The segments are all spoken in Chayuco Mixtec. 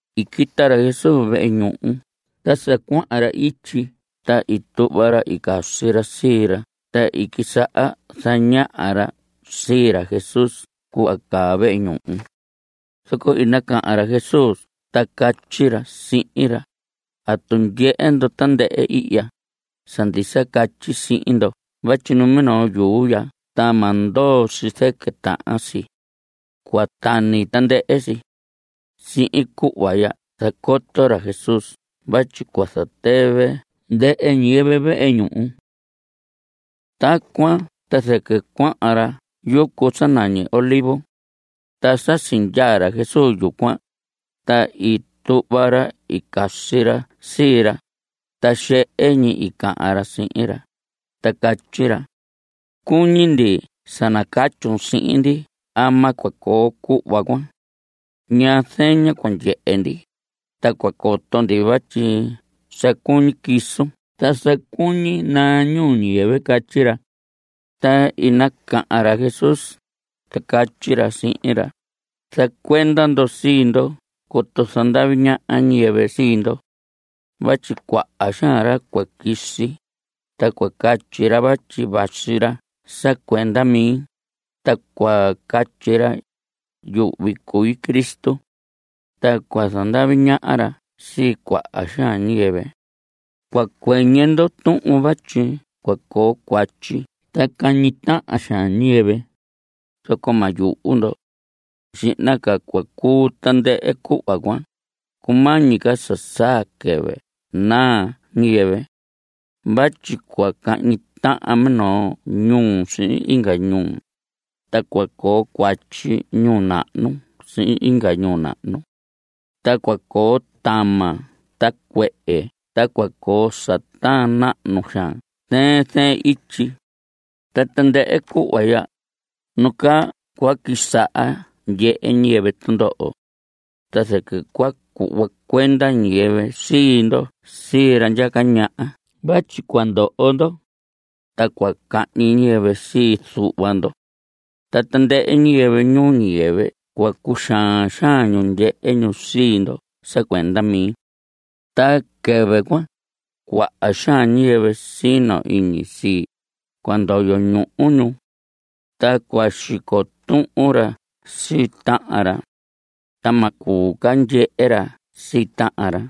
I quita ra Jesús vehe ñuhu ta sa cuahan ra ityi ta i tuhva ra i casi ra sii ra ta i quisaha zañaha ra sii ra Jesús cuhva caa vehe ñuhu. Zoco i nacahan ra Jesús ta catyi ra sihin ra: ¿Atu ndyehe ndo tandɨhɨ ihya? Sa ndisa catyi sihin ndo vatyi numinoo yuu ya ta ma ndoo si zɨquɨ tahan si. Cua tani tandɨhɨ si. (Sihin cuhva ya zacoto ra Jesús vatyi cua zatɨvɨ ndɨhɨ ñiyɨvɨ vehe ñuhu cuan.) Tacuan ta zɨquɨ cuahan ra yucu sa nañi Olivos. Ta sa sindyaa ra Jesús yucuan, ta i tuhva ra i casi ra sii ra, ta xehe ñi i cahan ra sihin ra, ta catyi ra: Cuñi ndi sa nacatyun sihin ndi ama cua coo cuhva cuan. ¿Ñaa zeña cua ndyehe ndi, ta cua coto ndi vatyi sa cuñi quisun ta sa cuñi naa ñuu ñiyɨvɨ? Catyi ra. Ta i nacahan ra Jesús, ta catyi ra sihin ra: Zacuenda ndo sii ndo coto zandavi ñaha ñiyɨvɨ sii ndo. Vatyi cuaha xaan ra cua quisi, ta cua catyi ra vatyi vasi ra sa cuenda mi, ta cua catyi ra: “Yuhvi cui Cristo.” Ta cua zandavi ñaha ra sii cuaha xaan ñiyɨvɨ. Cua cuɨñɨ ndo tuhun vatyi cua coo cuatyi ta cahñi tahan xaan ñiyɨvɨ, zoco ma yuhu ndo. Xihna ca cua cuu tandɨhɨ cuhva cuan, cumañi ca sa saa quɨvɨ naa ñiyɨvɨ. Vatyi cua cahñi tahan minoo ñuu sihin inga ñuu, ta cua coo cuatyi ñuu nahnu sihin inga ñuu nahnu. Ta cua coo tama ta cuehe ta cua coo sa taan nahnu xaan zɨɨn zɨɨn ityi. Ta tandɨhɨ cuhva ya, nu nacaa cua quisaha ndyehe ñiyɨvɨ tundoho. Ta zɨquɨ cua cuhva cuenda ñiyɨvɨ sii ndo sii ra ndyaca ñaha vatyi cua ndoho ndo. Ta cua cahñi ñiyɨvɨ sii zuhva ndo. Ta tandɨhɨ ñiyɨvɨ ñuu ñiyɨvɨ cua cuxaan xaan ñu ndyehe ñu sii ndo sa cuenda mi. Ta quɨvɨ cuan, cuaha xaan ñiyɨvɨ sino iñi sii, cua ndoyo ñuhu ñu. Ta cua xico tuhun ra sii tahan ra. Ta ma cuu ca ndyehe ra sii tahan ra.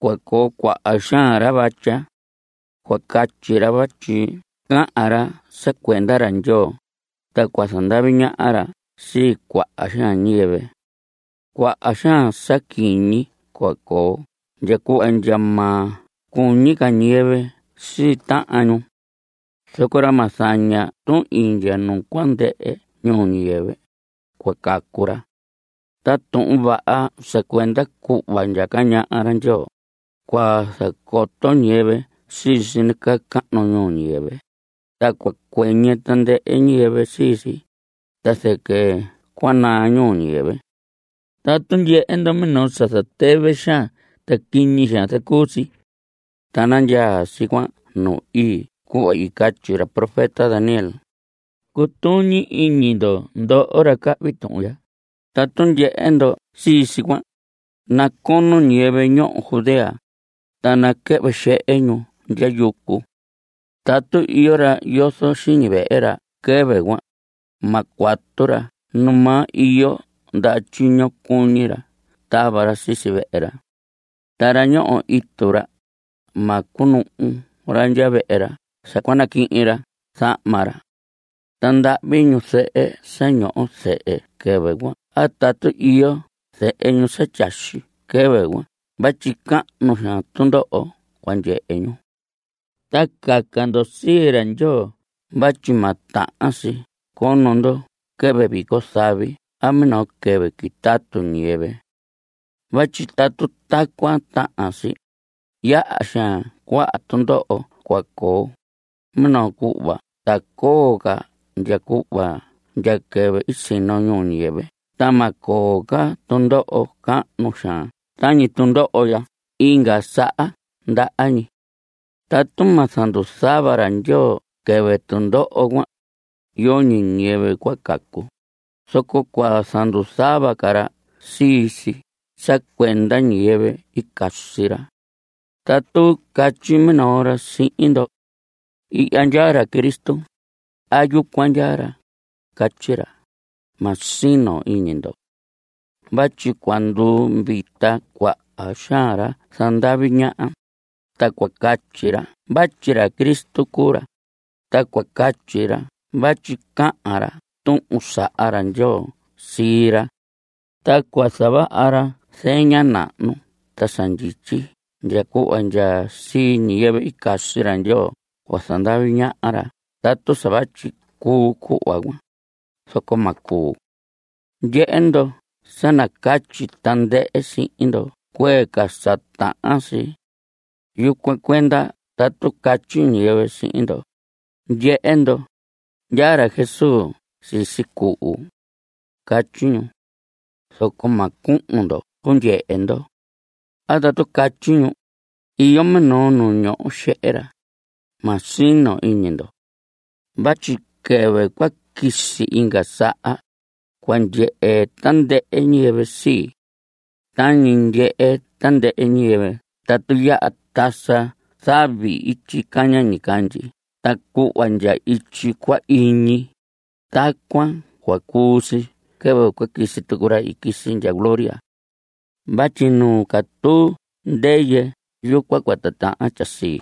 Cua coo cuaha xaan ra vatya. Cua catyi ra vatyi cahan ra sa cuenda ra Ndyoo, ta cua zandavi ñaha ra sii cuaha xaan ñiyɨvɨ. Cuaha xaan sa quiñi cua coo ndya cuhva ndya ma cuñi ca ñiyɨvɨ sii tahan ñu. Zoco ra ma zaña tuhin ndya nu cua ndɨhɨ ñuu ñiyɨvɨ, cua cacu ra. Ta Tuhun Vaha sa cuenda cuhva ndyaca ñaha ra Ndyoo, cua zacoto ñiyɨvɨ sii si nacahnu ñuu ñiyɨvɨ, ta cua cuɨñɨ tandɨhɨ ñiyɨvɨ sii si, ta zɨquɨ cua naa ñuu ñiyɨvɨ. Tatu ndyehe ndo minoo sa zatɨvɨ xaan ta quiñi xaan zacuu si, ta nandyaa si cuan nu ii cuhva i catyi ra profeta Daniel, cutuñi iñi ndo ndoho ra cahvi tuhun ya, tatu ndyehe ndo sii si cuan, nacono ñiyɨvɨ ñoho Judea, ta naquɨhvɨ xehe ñu ndya yucu. Tatu iyo ra yozo xiñi vehe ra quɨvɨ cuan, ma cuatu ra numaa iyo ndaha tyiño cuñi ra tava ra sisi vehe ra. Ta ra ñoho itu ra, ma cunuhu ra ndya vehe ra sa cua naquihin ra zahma ra. Ta ndahvi ñu zɨhɨ sa ñoho zehe quɨvɨ cuan a tatu iyo zehe ñu sa tyaxi quɨvɨ cuan vatyi cahnu xaan tundoho cua ndyehe ñu. Ta caca ndo sii ra Ndyoo vatyi ma tahan si cono ndo quɨvɨ vico zavi a minoo quɨvɨ quitatu ñiyɨvɨ vatyi tatu tacuan tahan si, yaha xaan cuaha tundoho cua coo, minoo cuhva ta coo ca ndya cuhva ndya quɨvɨ i sino ñuu ñiyɨvɨ ta ma coo ca tundoho cahnu xaan tañi tundoho ya inga saha ndaha ñi. Tatu ma zanduzuhva ra Ndyoo quɨvɨ tundoho cuan, yoñi ñiyɨvɨ cua cacu. Zoco cua zanduzuhva ca ra sii si sa cuenda ñiyɨvɨ i casi ra. Tatu catyi minoo ra sihin ndo: “Ihya ndyaa ra Cristo” a “Yucuan ndyaa ra”, catyi ra, ma sino iñi ndo. Vatyi cua nduvita cuaha xaan ra zandavi ñaha, ta cua catyi ra vatyi Cristo cuu ra, ta cua catyi ra vatyi cahan ra tuhun saha ra Ndyoo sii ra. Ta cua zavaha ra zeña nahnu ta sa ndyityi ndya cuhva ndya sii ñiyɨvɨ i casi ra Ndyoo cua zandavi ñaha ra tatu sa vatyi cuu cuhva cuan, zoco ma cuu. Ndyehe ndo, sa nacatyi tandɨhɨ sihin ndo cuee ca sa tahan si. Yucuan cuenda tatu catyi ñiyɨvɨ sihin ndo: “Ndyehe ndo, ndyaa ra Jesús sisi cuhu.” Catyi ñu. Zoco ma cuhun ndo cundyehe ndo. A tatu catyi ñu: “Iyo minoo nu ñoho xehe ra.” Ma sino iñi ndo. Vatyi quɨvɨ cua quisi inga saha, cua ndyehe tandɨhɨ ñiyɨvɨ sii. Tañi ndyehe tandɨhɨ ñiyɨvɨ tatu yaha tasa zavi ityi caña ñicandyi ta cuhva ndya ityi cua iñi, tacuan cua cuu si quɨvɨ quisi tucu ra i quisi ndya gloria. Vatyi nu catuu ndɨyɨ, yucuan cua titahan tyasii.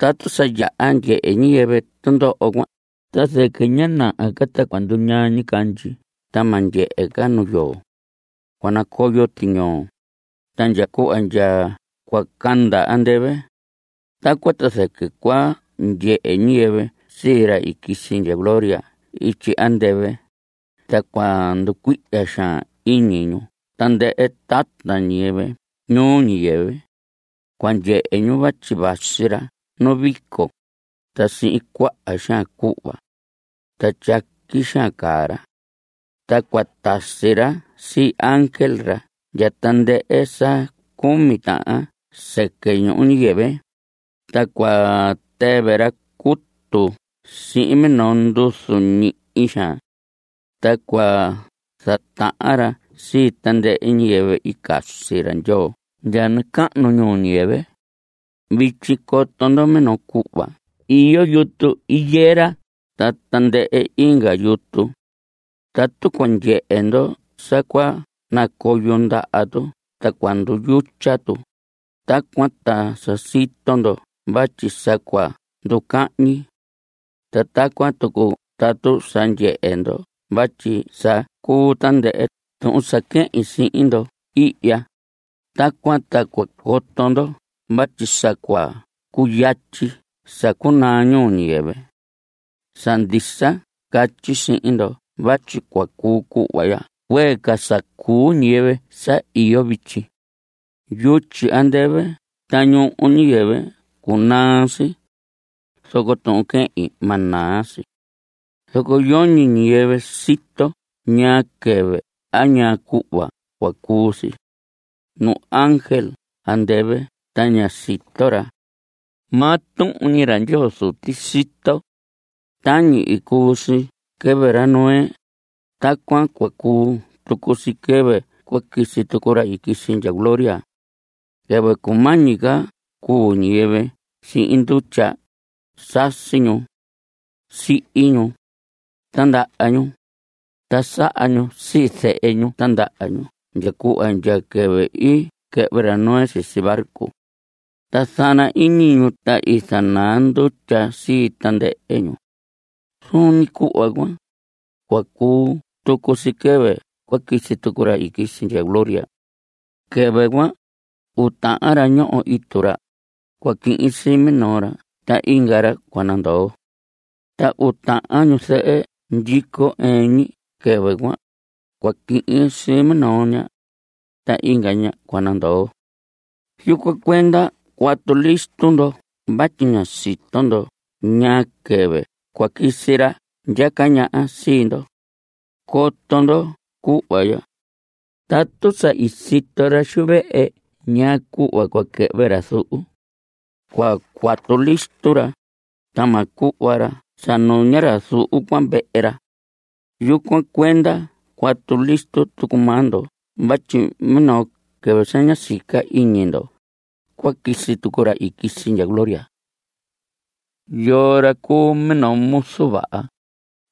Tatu sa yaha ndyehe ñiyɨvɨ tundoho cuan ta zɨquɨ ña naha ca ta cua nduñaa ñicandyi ta ma ndyehe ca nu yoo. Cua nacoyo tiñoo, ta ndya cuhva ndya cua canda andɨvɨ. Tacuan ta zɨquɨ cua ndyehe ñiyɨvɨ sii ra i quisi ndya gloria ityi andɨvɨ, ta cua nducuihya xaan iñi tandɨhɨ tata ñiyɨvɨ ñuu ñiyɨvɨ. Cua ndyehe ñu vatyi vasi ra nu vico, ta sihin cuaha xaan cuhva. Ta tyaqui xaan caa ra. Ta cua tasi ra sii ángel ra ndya tandɨhɨ sa cumi tahan sɨquɨ ñuu ñiyɨvɨ, ta cua tɨvɨ ra cutu sihin minoo nduzu ñihi xaan. Ta cua zatahan ra sii tandɨhɨ ñiyɨvɨ i casi ra Ndyoo ndya nacahnu ñuu ñiyɨvɨ. Vityi coto ndo minoo cuhva iyo yutu higuera ta tandɨhɨ inga yutu. Tatu cua ndyehe ndo sa cua nacoyo ndaha tu ta cua nduyutya tu, tacuan ta sa sito ndo vatyi sa cua nducahñi. Ta tacuan tucu tatu sa ndyehe ndo vatyi sa cuu tandɨhɨ tuhun sa quehin sihin ndo ihya, tacuan ta cua coto ndo vatyi sa cua cuyatyi sa cunaa ñuu ñiyɨvɨ. Sa ndisa catyi sihin ndo vatyi cua cuu cuhva ya cuee ca sa cuu ñiyɨvɨ sa iyo vityi. Yutyi andɨvɨ ta ñuhu ñuu ñiyɨvɨ cunaa si. Zoco tuhun quehin, ma naa si. Zoco yoñi ñiyɨvɨ sito ñaa quɨvɨ a ñaa cuhva cua cuu si. Nu ángel andɨvɨ ta ña sito ra. Maa tuhun ñi ra Ndyoo Zuti sito. Tañi i cuu si quɨvɨ ra Noé, tacuan cua cuu tucu si quɨvɨ cua quisi tucu ra i quisi ndya gloria. Quɨvɨ cumañi ca cuu ñiyɨvɨ sihin ndutya, sasi ñu. Sihi ñu. Tindaha ñu. Ta saha ñu sii zehe ñu tindaha ñu ndya cuhva ndya quɨvɨ i quɨhvɨ ra Noé sisi barco. Ta zana ñi iñi ñu, ta i zanaa ndutya sii tandɨhɨ ñu. Zuun ñi cuhva cuan, cua cuu tucu si quɨvɨ cua quisi tucu ra i quisi ndya gloria. Quɨvɨ cuan, uu tahan ra ñoho itu ra, cua quihin sii minoo ra. Ta inga ra cua nandoo. Ta uu tahan ñuzɨhɨ ndyico ɨɨn ñi quɨvɨ cuan, cua quihin sii minoo ña. Ta inga ña cua nandoo. Yucuan cuenda cuatu listo ndo vatyi ña sito ndo ñaa quɨvɨ cua quisi ra ndyaca ñaha sii ndo. Coto ndo cuhva ya, tatu sa i sito ra xu vehe ñaa cuhva cua quɨhvɨ ra zuhu, cua cuatu listo ra, ta ma cuhva ra sa nuña ra zuhu cuan vehe ra. Yucuan cuenda cuatu listo tucu maa ndo vatyi minoo quɨvɨ sa ña sica iñi ndo, cua quisi tucu ra i quisi ndya gloria. ¿Yoo ra cuu minoo muzu vaha,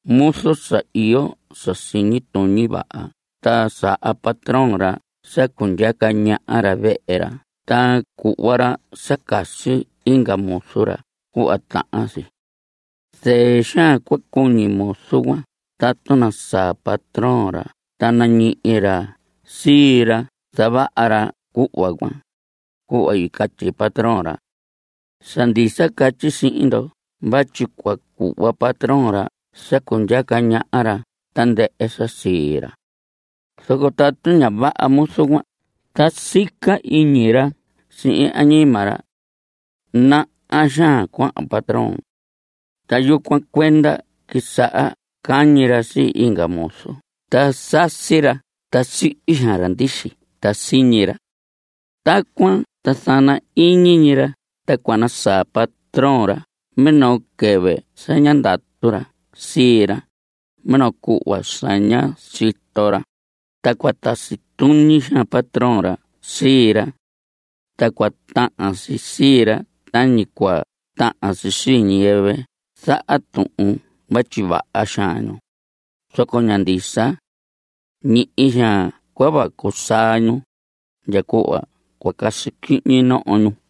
muzu sa iyo sa siñi tuñi vaha ta saha patrón ra sa cundyaca ñaha ra vehe ra ta cuhva ra sa casi inga muzu ra cuhva tahan si? Zɨɨ xaan cua cuñi muzu cuan tatu nasaa patrón ra ta nañihi ra sii ra zavaha ra cuhva cuan, cuhva catyi patrón ra. Sa ndisa catyi sihin ndo vatyi cua cuhva patrón ra sa cundyaca ñaha ra tandɨhɨ sa sii ra. Zoco tatu ña vaha muzu cuan ta sica iñi ra sihin añima ra: “Naha xaan cuahan patroin.” Ta yucuan cuenda quisaha cañi ra sii inga muzu ta sasi cuahyi ra ta sihi xaan ra ndixi ta siñi ra. Tacuan ta zana ñi iñi ra ta cua nasaa patrón ra minoo quɨvɨ sa ña ndatu ra sii ra, minoo cuhva sa ña sito ra, ta cua tasi tuñi xaan patrón ra sii ra. Ta cua tahan si sii ra tañi cua tahan si sii ñiyɨvɨ zaha tuhun vatyi vaha xaan ñu, zoco ña ndisa. Ñihi xaan cua vacu saa ñu, ndya cuhva cua casi quihñi noho ñu.